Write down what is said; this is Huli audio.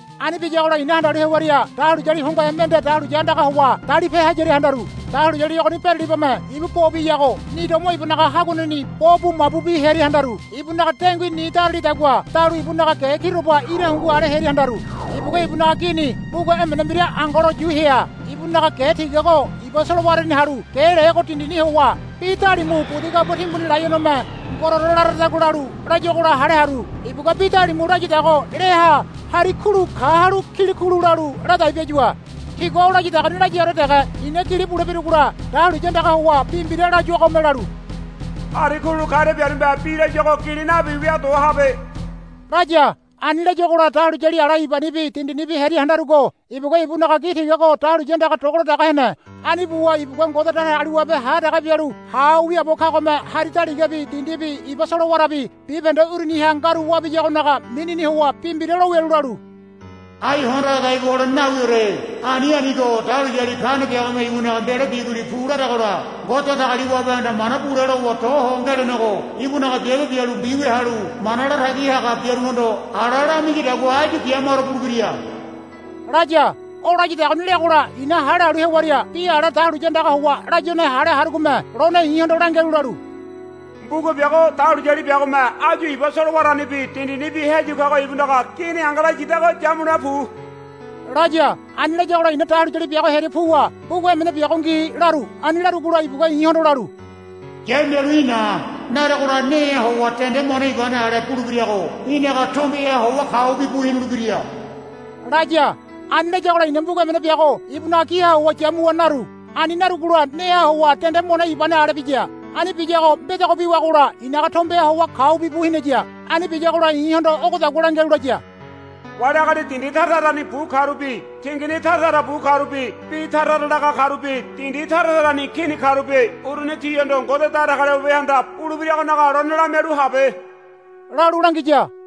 Ani biyagola i̱na handalu hewaria dahuliyali hongohe mende dahuliya andagaha howa dalipe hayaria handaru. Dahuliyali ogoni beralibame ibu bo biyago ni domo ibunaga haguaneni bo bu mabubi hearia handaru. Ibunaga dengui ni daralidagua dalu ibunaga ge kiroba ira hungu ale hearia handaru. Ibugua ibunaga gini mbuga emene mbira angalo yu hea. Ibunaga ge tigago iba solowarani halu ge lego dindini howa bi dalimu budi gabua timbuni laionome ngororo laradagua lalu layuagola hale haru. Ibugua bi dalimu layadago leaha hari kulu kahalu kilikulu lalu ladai biayua. Tigua o layadagoni layaore dege i̱na gili bule birugola dahuliya andaga howa bi mbira layuagome lalu, Hari kulu karia biarume bi layuago gili nabi wia do habe, laya. Ani layuagola dahuliyali ala ibanibi dindinibi hearia handarugo ibugua ibunaga gi tigago dahuliya andaga doladaga hene. Ani buwa ibugua Ngode Datagaliwabe ha dege bialu ha ho wiaabo kagome hari daligabi dindibi iba solowarabi bibahende uruniha ngaru wabiyagonaga minini howa bi mbira lo wialu lalu, Ai hondo ha dai bu holene nawiore. Ani anigo dahuliyali kane biagome ibunaga mbelo biguli pu laragola Ngode Datagaliwabehanda mana bule lowa do ho ngelenego ibunaga biabe bialu mbiwia halu mana latagi haga biaruhondo ala lamiyadagua áyu bia maro bulebira, laya. O layadagoni leagola i̱na hale halu hewaria bi ala dahuliya andaga howa layuane hale harugome lone i̱hondo langialu lalu, Mbuga biago dahuliyali biagome áyu iba solowaranibi dindinibi heyu kago ibunaga gini angalo yidago yamule pu, laya. Ani layagola i̱na dahuliyali biago hearia puwa, Mbuga emene biago ngi, laru. Ani larugola ibugua i̱hondo lalu, Yamialu í̠ na. Naregola neha howa dende mone ibane dende ale bulebirago í̠naga tombeha howa kaubi bu hinulebira, laya. Ani layagola i̱na mbuga emene biago ibunaga giha howa yamuwa naru. Ani narugola neha howa dende mone ibane ale biya. Ani biyago mbedogo biwagola i̱naga tombeha howa kaubi bu hinaya. Ani biyagola i̱hondo ogodagua langialu laya, Wali agali dindi tara tarani bu karubi tingini tara tara bu karubi bi tara tara laga karubi dindi tara tarani kini karubi uruni tihondo Ngode Datagaliwabehanda bulebiragonaga lone lamialu habe, lalu langiya.